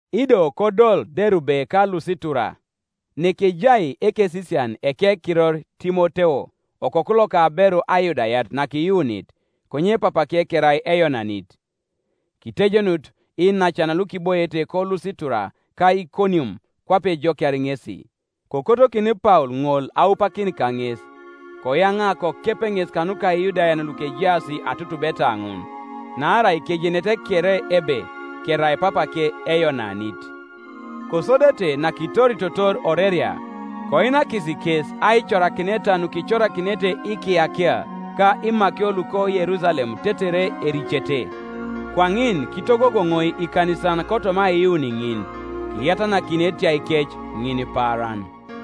Ido kodol Derube ka Lusitura: nekejai ekesisian ekekiror Timoteo, okoku loka aberu Ayudayat nakiyuunit; konye papake kerai Eyonanit. Kitejenut iinacan lukiboiete koLusitura ka Ikonium kwape ejokiar ŋesi. Kokotokin Paul ŋol aupakin kaŋes; koyaŋa kokep ŋes kanuka Iyudayan lukejaas atutubeta ŋun, naarai kejenete kere ebe kerai papake Eyonanit. Kosodete nakitoritotor oreria, koinakis kes aicorakineta nukicorakinete ikiyakia ka imakio luko Yerusalem tetere ericete. Kwaŋin kitogogoŋoi ikanisan kotoma aiyuun ŋin, kiyatanakin etiaikec ŋinipaaran.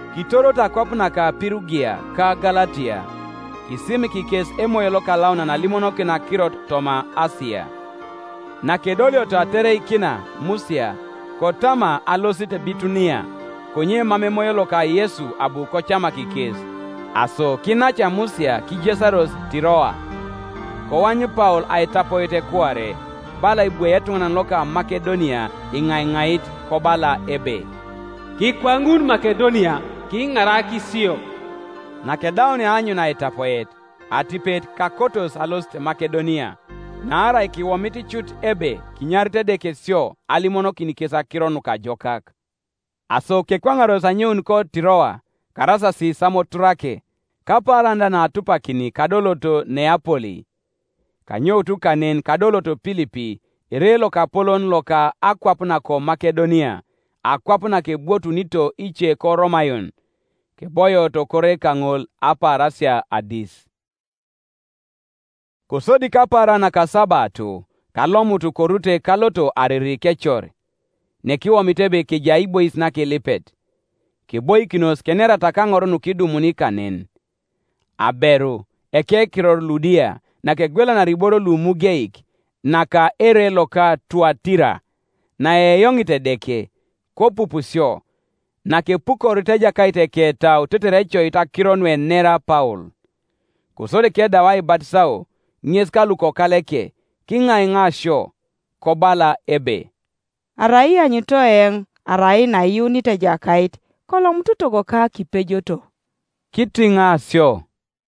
Kitoroto akwap naka Pirugia ka Galatia, kisimik kes Emoyo Lokalaunan alimonokin akirot toma Asia. Nakedolioto atereikina Musia, kotama alosit Bitunia, konye mam Emoyo loka Yesu abu kocamak kes, Aso kinaca Musia kijesaros Tiroa. Koany Paul aitapoet kuare: bala ebwoi etuŋanan loko Makedonia iŋaiŋait kobala ebe, “Kikwaŋun Makedonia, kiŋarak sio.” Nakedaunia aanyun aitapoet, atipet kakotos alosit Makedonia, naarai kiwomit cut ebe kinyarit Edeke sio alimonokin kes akiro nukajokak. Aso kekwaŋaros anyoun koTiroa, karasasi Samoturake, kapaaran da naatupakini kadoloto Neapoli. Kanyoutu kanen kadoloto Pilipi, ere lokapolon loka akwap nako Makedonia, akwap nakebwotunito ice ko Romayon. Keboioto kore kaŋol apaarasia adis. Kosodi kapaaran nakasabato kalomutu korute kaloto ariri kecor, nekiwomit ebe kejai aibois nakilipet; keboikinos kenerata kaŋor nukidumuni kanen. Aberu, ekekiror Ludia, nakegwelanari iboro lumugeik, naka ere loka Tuatira, naeyoŋit Edeke, kopup sio: nakepukorit Ejakait eketau tetere ecoit akiro nuenera Paul. Kosodi kedau aibatisao, ŋes ka lukokaleke, kiŋaiŋa sio, kobala ebe, “Arai ianyunito eoŋ arai naiyuunit Ejakait, kolomutu togoka kipejoto.” Kitiŋa sio.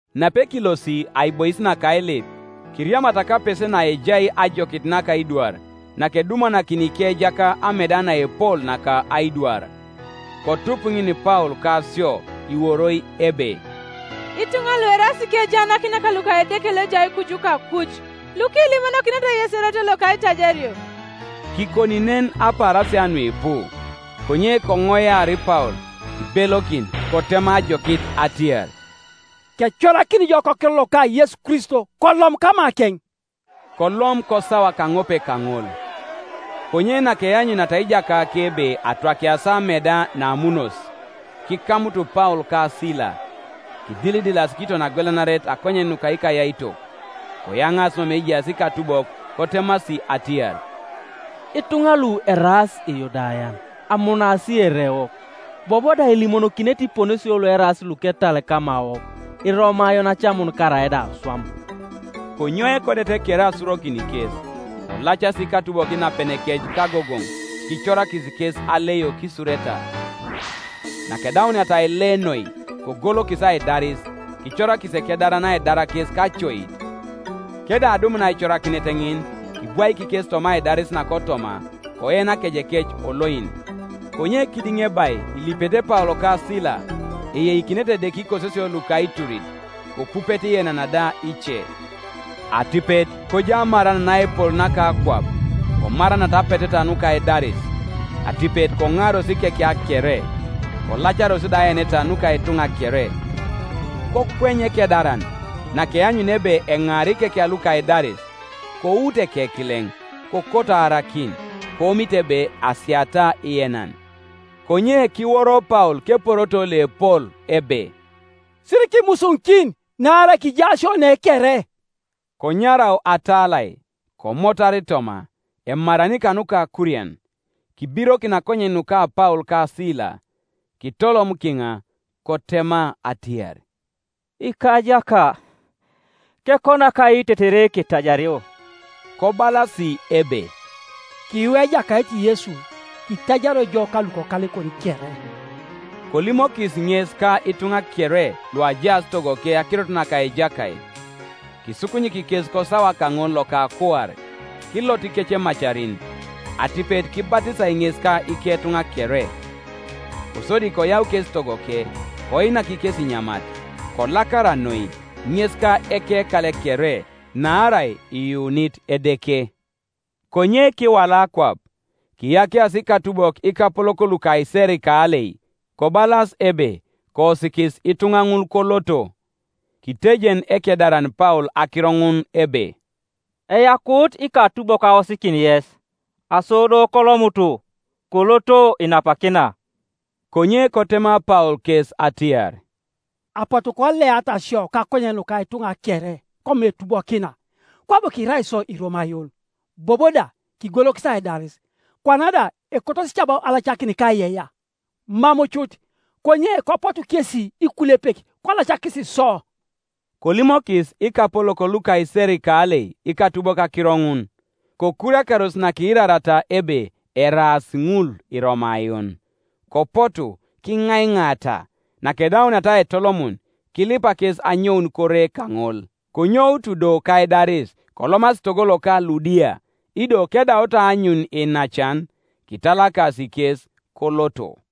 Napekilosi aibois naka ailip, keriamata kapese naejai ajokit naka aidwar, nakedumanakini ikejaka ameda naepol naka aidwar. Kotupu ŋin Paul ka sio iworoi ebe, “Ituŋa lu eraas ikejaanakinak luka Edeke loejai kuju kakuj, lukilimonokinete yes erot loka aitajario.” Kikoni nen apaarasia nuipu. Konye koŋoiar Paul, kibelokin kotema ajokit atiar, “Kecorakini jo kokiror loka Yesu Kristo kolom kamakeŋ.” Kolom kosawa kaŋope kaŋol. Konye nakeanyuniata ijakake ebe atwakiasi ameda naamunos, kikamutu Paul ka Sila, kidilidilasi kiton agwelanaret akonyen nuka ikayaitok; koyaŋaasi mama ejaas ikatubok kotemasi atiar, “Ituŋa lu eraas Iyudayan, amunaasi erewok, bobo da elimonokinete iponesio lueraas luketal kamawok Iromayon acamun karaida aswam.” Konyou ekodet kere asurokin kes: kolacasi ikatubok inapenekec kagogoŋ, kicorakis kes aleio kisureta. Nakedauniata aile noi, kogolokis aidaris, kicorakis ekedaran aidar kes kacoit, Kedau adumun aicorakinet ŋin, kibwaik kes toma aidaris nakotoma, koen akejekec oloin. Konye kidiŋebai ilipete Paul ka Sila, eyeikinete Edeke ikososio luka aiturit, kopupete ienan da ice; atipet kojau amaran naepol naka akwap, komaranata apeteta nuka aidaris; atipet koŋaaros ikekia kere, kolacaros da aeneta nuka ituŋa kere, Kokweny ekedaran, nakeanyunia ebe eŋaara ikekia luka aidaris, kout ekekileŋ, kokoto aarakin, koomit ebe asiata ienan. Konye kiworo Paul keporoto loepol ebe, “Sirikimusuŋikin, naarai kija isio ne kere.” Konyarau atalai, komotar toma, emarani kanuka akurian, kibirokin akonyen nuka Paul ka Sila, kitolom kiŋa, kotema atiar, “Ikajaka, kekonak ai tetere ketajario?” Kobalasi ebe, “Kiyuu Ejakait Yesu, kitajario jo ka lukokalekon kere.” Kolimokis ŋes ka ituŋa kere luajaas togoke akirot naka Ejakait, Kisukunyik kes kosawa kaŋol loka akuare, kilot ikecemacarin, atipet kibatisai ŋes ka iketuŋa kere. Kosodi koyau kes togoke, koinak kes inyamat, kolakara noi, ŋes ka ekekale kere, naarai iyuunit Edeke. Konye kiwala akwap, kiyakiasi ikatubok ikapolok luka iserikalei, kobalas ebe, “Koosikis ituŋa ŋul koloto.” Kitejen ekedaran Paul akiro ŋun ebe, “Eyakuut ikatubok aosikin yes: aso do kolomutu, koloto inapakina.” Konye kotema Paul kes atiar, “Apotu koleata sio kakonyen nuka ituŋa kere, komam etubokina, kwabo kirai isio Iromayon, bobo da kigolokis aidaris; kwana da ekotosi cabo alacakin kaiyeiyea? Mam cut; konye kopotu kesi ikulepek kolacakis sio.” Kolimokis ikapolok luka iserikalei ikatubok akiro ŋun; kokuriakaros nakiirariata ebe eraas ŋul Iromayon; kopotu, kiŋaiŋaata; nakedauniata aitolomun, kilipa kes anyoun kore kaŋol. Konyoutu do kaidaris kolomasi togo loka Ludia: ido kedaut aanyun iinacan, kitalakasi kes, koloto.